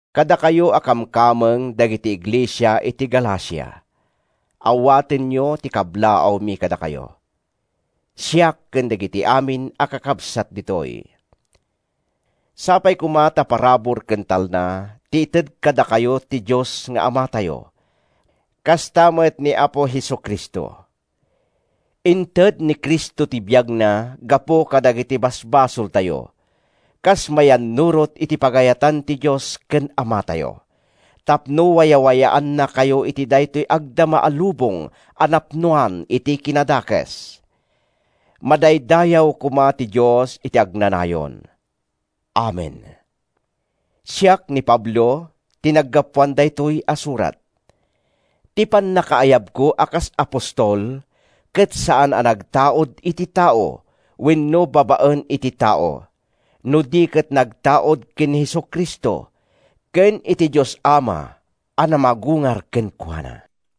Kadakayo a kamkameng dagiti iglesia iti Galacia, Awatenyo ti kablaawmi kadakayo, siak ken dagiti amin a kakabsat ditoy. Sapay koma ta parabur ken talna ti ited kadakayo ti Dios nga Amatayo kasta met ni Apo Jesu-Cristo. Inted ni Cristo ti biagna gapu kadagiti basbasoltayo, kas mayannurot iti pagayatan ti Dios ken Amatayo, tapno wayawayaannakayo iti daytoy agdama a lubong a napnoan iti kinadakes. Madaydayaw koma ti Dios iti agnanayon! Amen. Siak, ni Pablo, ti naggapuan daytoy a surat. Ti pannakaayabko a kas apostol ket saan a nagtaud iti tao wenno babaen iti tao no di ket nagtaud ken ni Jesu-Cristo ken iti Dios Ama a namagungar kenkuana.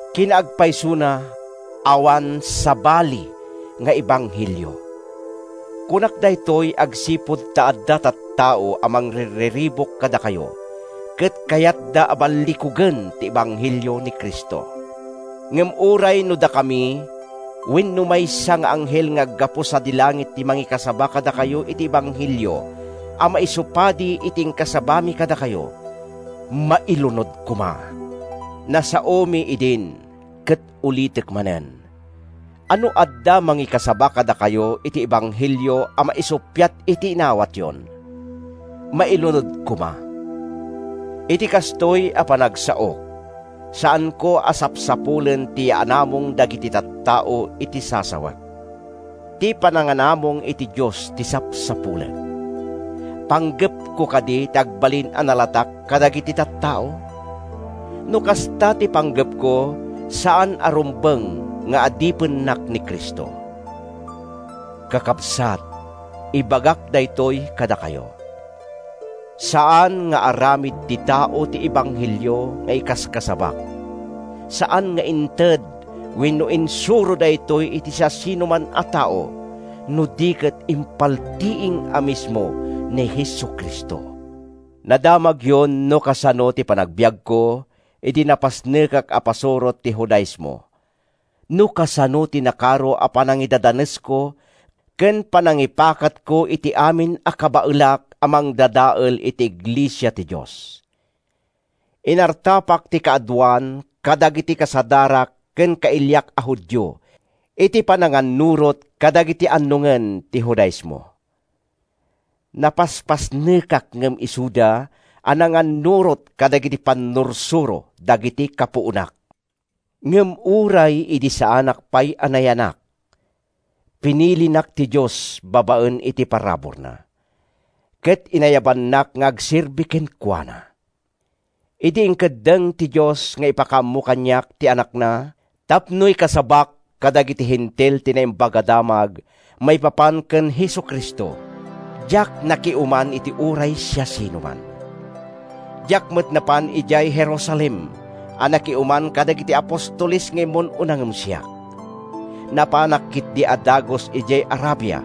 Kinaagpaysona, awan “sabali nga ebanghelio.” Kunak daytoy agsipud ta adda tattao a mangrirriribuk kadakayo ket kayatda a ballikugen ti ebanghelio ni Cristo. Ngem uray no dakami wenno maysa nga anghel nga aggapu sadi langit ti mangikasaba kadakayo iti ebanghelio a maisupadi iti inkasabamin kadakayo, mailunod koma! Nasaomi idin, ket ulitek manen, a no adda mangikasaba kadakayo iti ebanghelio a maisuppiat iti inawatyon, mailunod koma! Iti kastoy a panagsaok, saanko a sapsapulen ti yaanamong dagiti tattao iti sasawek. Ti pananganamong ti Dios ti sapsapulek. Panggepko kadi ti agbalin a nalatak kadagiti tattao? No kasta ti panggepko, saan a rumbeng nga adipennak ni Cristo. Kakabsat, ibagak daytoy kadakayo: Saan nga aramid ti tao ti ebanghelio nga ikaskasabak. Saan nga inted wenno insuro daytoy iti siasinoman a tao no di ket impaltiing a mismo ni Jesu-Cristo. Nadamagyon no kasano ti panagbiagko idi napasnekak a pasurot ti Judaismo, no kasano ti nakaro a panangidadanesko ken panangipakatko iti amin a kabaelak a mangdadael iti iglesia ti Dios. Inartapak ti kaaduan kadagiti kasadarak ken kailiak a Judio iti panangannurot kadagiti annongen ti Judaismo. Napaspasnekak ngem isuda a nangannurot kadagiti pannursuro dagiti kapuonak. Ngem uray idi saanak pay a nayanak, pinilinak ti Dios babaen iti paraburna, ket inayabannak nga agserbi kenkuana. Idi inkeddeng ti Dios nga ipakaammo kaniak ti Anakna tapno ikasabak kadagiti Hentil ti Naimbag a Damag maipapan ken Jesu-Cristo, diak nakiuman iti uray siasinoman. Diak met napan idiay Jerusalem a nakiuman kadagiti apostoles nga immun-una ngem siak. Napanak ketdi a dagus idiay Arabia,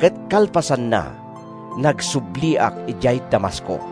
ket kalpasanna, nagsubliak idiay Damasco.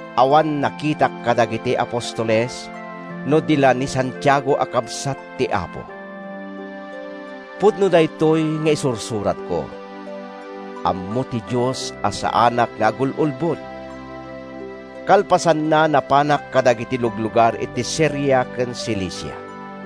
Awan nakitak kadagiti apostoles no di la ni Santiago a kabsat ti Apo. Pudno daytoy nga isursuratko. Ammo ti Dios a saanak nga agul-ulbod! Kalpasanna, napanak kadagiti luglugar iti Siria ken Cilicia.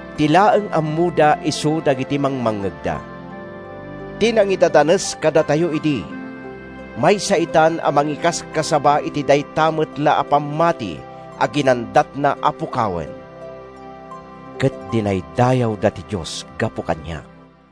Ti laeng ammoda isu dagiti mangmangngegda: “Ti nangidadanes kadatayo idi, maysa itan a mangikaskasaba iti dayta met la a pammati a ginandatna a pukawen!” Ket dinaydayawda ti Dios gapu kaniak.